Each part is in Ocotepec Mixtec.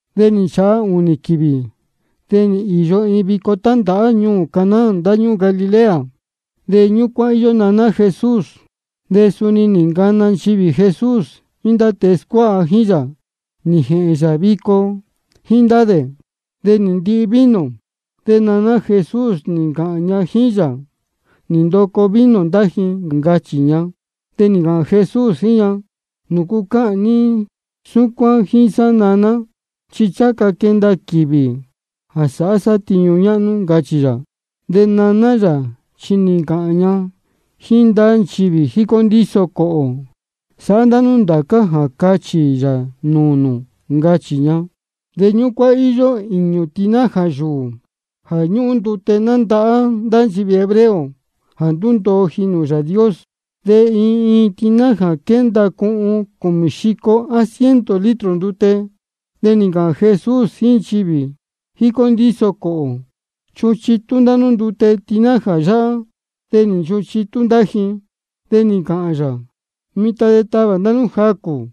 De nī nchāha ūnī quīvī, de nī īyo iin vico tándāhá ñuū Caná ndáñúū Galilea. De ñúcuán íyó naná Jesús. De suni nī ncana nchivī Jesús jíín ndá tēe scuáha jíín yā, nī jēhēn yā vico jíín ndá dē. De nī ndoco vino. De naná Jesús nī ncāhān ña jíín yā: Nī ndoco vino ndá ji, ncachī ña. De nī ncāhān Jesús jíín ña: ¿De nūcu cáhān ní súcuán jíín sá, naná? Chi ncháha ca quenda quīvī jā sāhá sá tiñu ñáhnú, ncachī yā. De naná yā chi nī ncāhān ña jíín ndá nchivī jícó ndíso cōhō: Sāhá ndá nú ndācá jā cáchī yā nūū nū, ncachī ña. De ñúcuán íyó īñū tinaja yūū jā ñúhun ndute nándahá ndá nchivī hebreo jā ndúndoo ji nūū Yāā Dios. De iin iin tinaja quénda cuhun cūmī xico á ciento litro ndute. De nī ncāhān Jesús jíín nchivī jícó ndíso cōhō: Chuhun chitú ndá nú ndute tinaja yáhá. De nī nchuhun chitú ndá ji. De nī ncāhān yā: Mitan de tavā ndá nú jacū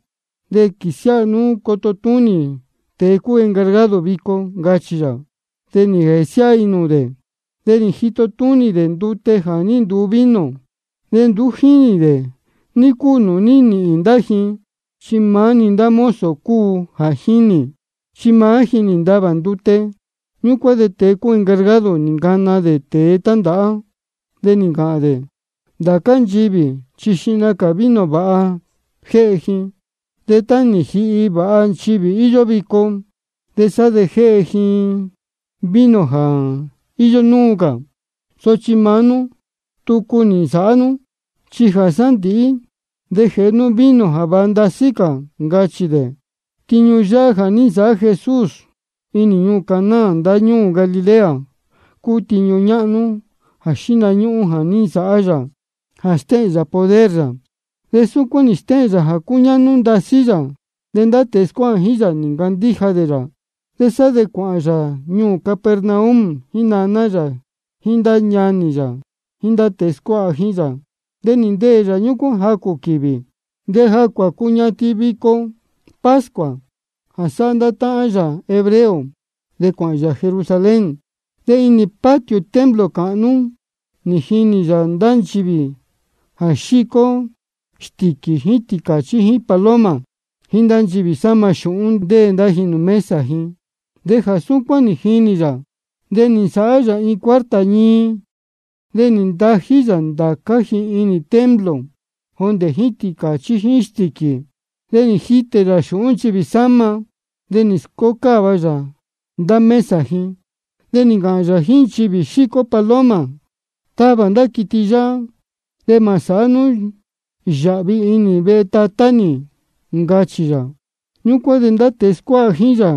de quīsiáha nú coto túnī tēe cúu encargado vico, ncachī yā. De nī jēsiáha ji nūū dē. De nī jito túnī dē ndute jā ní nduu vino, de nduú jínī dē ní cúu nūū ní nīhīn ndá ji. Chi maá-ni ndá mozo cúu jā jínī, chi maá ji nī ntavā ndute. Ñúcuán de tēe encargado nī ncana dē tēe tándāhá. De nī ncāhān dē: Ndācá nchivī chi xihna cā vino vāha jéhe ji, de tá nī jihi vāha nchivī íyó vico, de sá de jéhe ji vino jā íyó núu cā. Sochi maá nú tucu nī nsāhá nú, chi jā sándīhí de jéhe nú vino jā váha ndasí cā, ncachī dē. Tiñu yáhá jā ní nsāhá Jesús inī ñuū Caná ndáñúū Galilea cúu tiñu ñáhnú jā xíhna ñúhún jā ní nsāhá yā jā stéhēn yā poder yā. De súcuán nī stéhēn yā jā cúñáhnú ndasí yā. De ndá tēe scuáha jíín yā nī ncandíja dē yā. De sá de cuāhān yā ñuū Capernaum jíín naná yā jíín ndá ñanī yā jíín ndá tēe scuáha jíín yā. De nī ndeē yā ñúcuán jacū quīvī. De jā cuácuñatin vico pascua jā sáhá ndá táhán yā hebreo, de cuāhān yā Jerusalén. De inī patio templo cāhnú nī jinī yā ndá nchivī jā xícó stīquī jíín tīcāchí jíín paloma, jíín ndá nchivī sáma xūhún, ndéē ndá ji nūū mesa ji. De jā súcuán nī jinī yā, de nī nsāhá yā iin cuarta ñii. De nī ntají yā ndācá ji inī templo, jondē jíín tīcāchí jíín stīquī ji. De nī jitē yā xūhún nchivī sáma. De nī scócáva yā ndá mesa ji. De nī ncāhān yā jíín nchivī xícó paloma: Tavā ndá quiti yáhá. De mā sāhá nú yāhvi inī vehe Tatá nī, ncachī yā. Ñúcuán de ndá tēe scuáha jíín yā,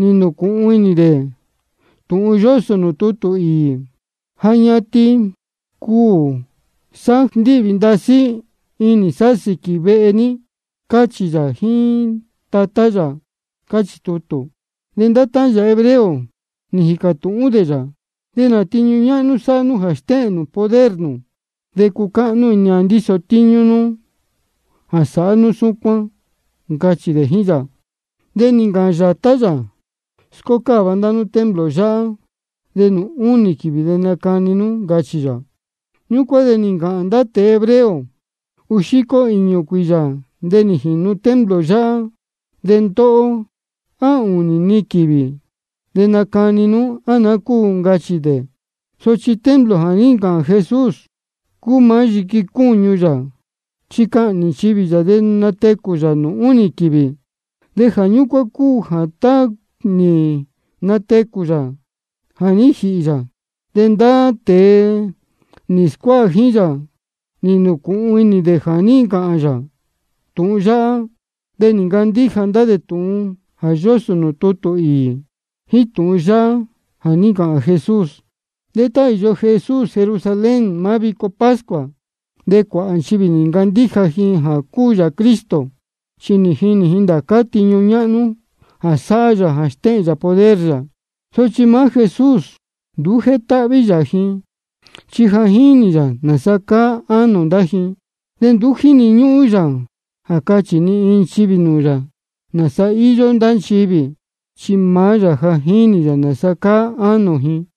nī nūcūhun inī dē tūhun yósō nūū tutū īī: Ja ñatin cuū sá jā ndíhvī ndasí inī sá sīquī vehe ní, cáchī yā jíín Tatá yā, cáchī tutū. De ndá táhán yā hebreo nī jīcā tūhún dē yā: ¿De nā tiñu ñáhnú sāhá nú jā stéhēn nū poder nū, de cucáhnú inī ni jā ndíso tíñú nú jā sáhá nú súcuán? ncachī dē jíín yā. De nī ncāhān yātá yā: Scócáva ndá nú templo yáhá, de nūū únī quīvī de nacani nī, ncachī yā. Ñúcuán de nī ncāhān ndá tēe hebreo: Uū xico īñū cuīyā de nī jīnu templo yáhá. De ndóhó, ¿á nūū únī-ni quīvī de nacani nú, á naá cúu? ncachī dē. Sochi templo jā ní ncāhān Jesús cúu maá yiqui cúñu yā, chi cahnī nchivī yā de natecū yā nūū únī quīvī. Jā ñúcuán cúu jā tá nī natecū yā jā ní jīhī yā, de ndá tēe nī scuáha jíín yā nī nūcūhun inī dē jā ní ncāhān yā tūhun yáhá. De nī ncandíja ndá dē tūhun jā yósō nūū tutū īī, jíín tūhun yáhá jā ní ncāhān Jesús. De tá íyó Jesús Jerusalén maá vico pascua, de cuāhā nchivī nī ncandíja ji jā cúu yā Cristo, chi nī jinī ji ndācá tiñu ñáhnú jā sáhá yā jā stéhēn yā poder yā. Sochi maá Jesús nduú ní jétáhví yā ji, chi ja jínī yā nāsa cáá inī ánō ndá ji. De nduú jíni ñúhún jā cachī ni iin nchivī nūū yā nāsa íyó ndá nchivī, chi maá yā ja jínī yā nāsa cáá inī ánō ji.